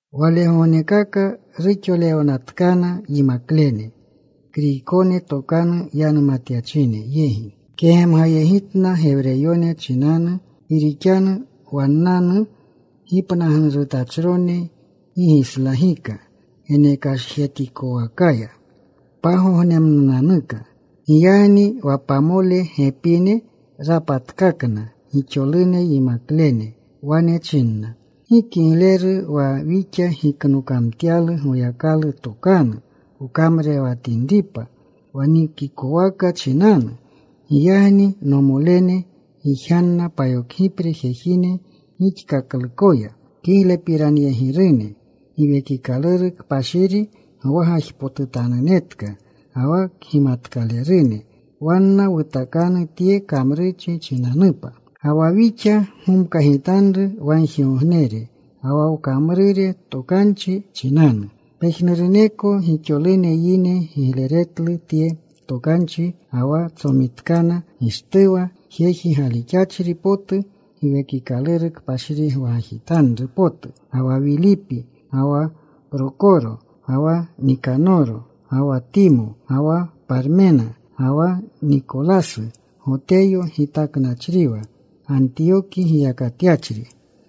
Walegognekaka ruxolewnatkana yimaklene, Kriykone tokanu yanumatyachine yegi kegemgayegitna Gewreyone chinanu, gi rixanu wannanu gipnagnurutachrone gi gislagika geneksajetikowakaya pagognemnunanuka. Giyagni wa pamole gepine rapatkakna gixolune yimaklene. Wane chinna, “Gi kigleru wa wixa giknokamtyalu Goyakalu tokanu wkamrurewatinripa wa nikikowaka chinanu. Giyagni, nomolene, gijganna payokgipre jejine gixkaklukoya kiglepiranyegirune, Giwekikaluru Kpashiri gwagajpotutanunetka ga wa kgimatkalerune. Wanna wutakanu tye kamrurchi chinanupa. Ga wa wixa gomkagitanru wagjigognere ga wa wkamrure tokanchi chinanu.” Pejnuruneko gixolune yine gigleretlu tye tokanchi. Ga wa tsomitkana Gishtuwa, jeji galixachri potu Giwekikaluru Kpashiri gwagajitanru potu ga wa Wilipi, ga wa Prokoro, ga wa Nikanoro, ga wa Timo, ga wa Parmena, ga wa Nikolasu, Goteyo gitaknachriwa, Gantiyoki giyakatyachri.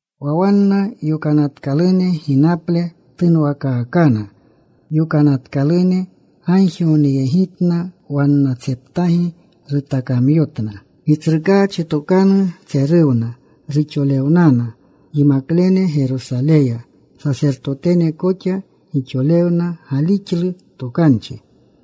Wa wanna yokanatkalune ginaple tunwakaakana. Yokanatkalune gagjigogneyegitna. Wannatseptagi rutakamyotna. Gitsrukaachi tokanu tseruwna. Ruxolewnana yimaklene Gerosaleya. Sasertotene koxa gixolune galixlu tokanchi.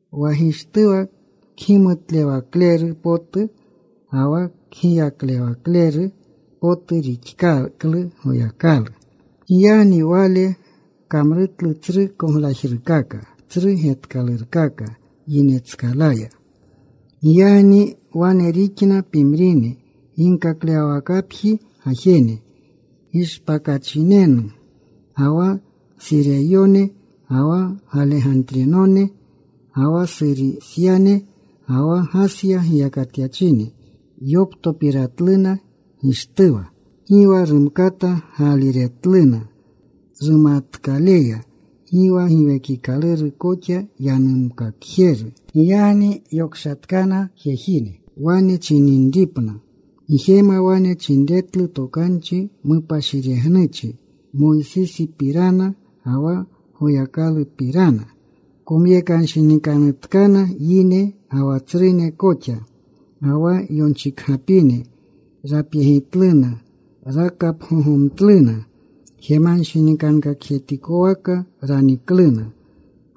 Wa Gishtuwa kgimutlewakleru potu ga wa kgiyaklewakleru potu rixkaklu Goyakalu. Giyagni wale kamrutlu tsru koglajrukaka, tsru getkalurkaka yinetskalaya. Giyagni wane rixna pimrine ginkaklewawakapji gajene Gishpakachinenu, ga wa Sureyone, ga wa Galegantrinone, ga wa Surisyane, ga wa Gasya giyakatyachine. Yoptopiratluna Gishtuwa. Gi wa rumkata gaaliretluna rumatkaleya, gi wa Giwekikaluru koxa yanumkakjeru. Giyagni yokshatkana jejine wane chininripna, “Wjema wane chinretlu tokanchi mupashiregnuchi Moysisipirana ga wa Goyakalupirana.” Komyekanshinikanutkana yine ga wa tsrune koxa, ga wa yonchikgapine. Rapyegitluna. Rakapgogomtluna. Jemanshinikankakjetikowaka ranikluna.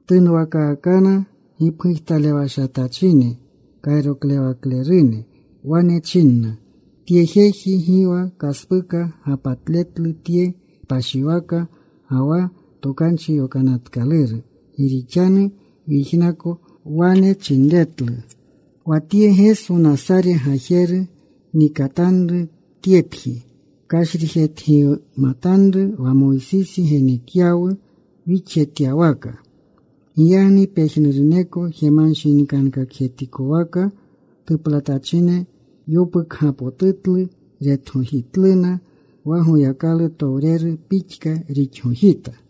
Tunwakaakana gipgujtalewashatachine kayroklewaklerune. Wane chinna, “Tye jeji gi wa kaspuka gapatletlu tye kpashiwaka ga wa Tokanchi Yokanatkaluru. Gi rixanu wyijnako wane chinretlu, ‘Wa tye Geso Nasare gajeru nikatanru tyepji. Kashrijetgimatanru wa Moysisi genekyawu wixjetyawaka.’” Giyagni pejnuruneko jemanshinikankakjetikowaka tuplatachine yopukgapotutlu. Retgojitluna. Wa Goyakalutowreru pixka rixgojita.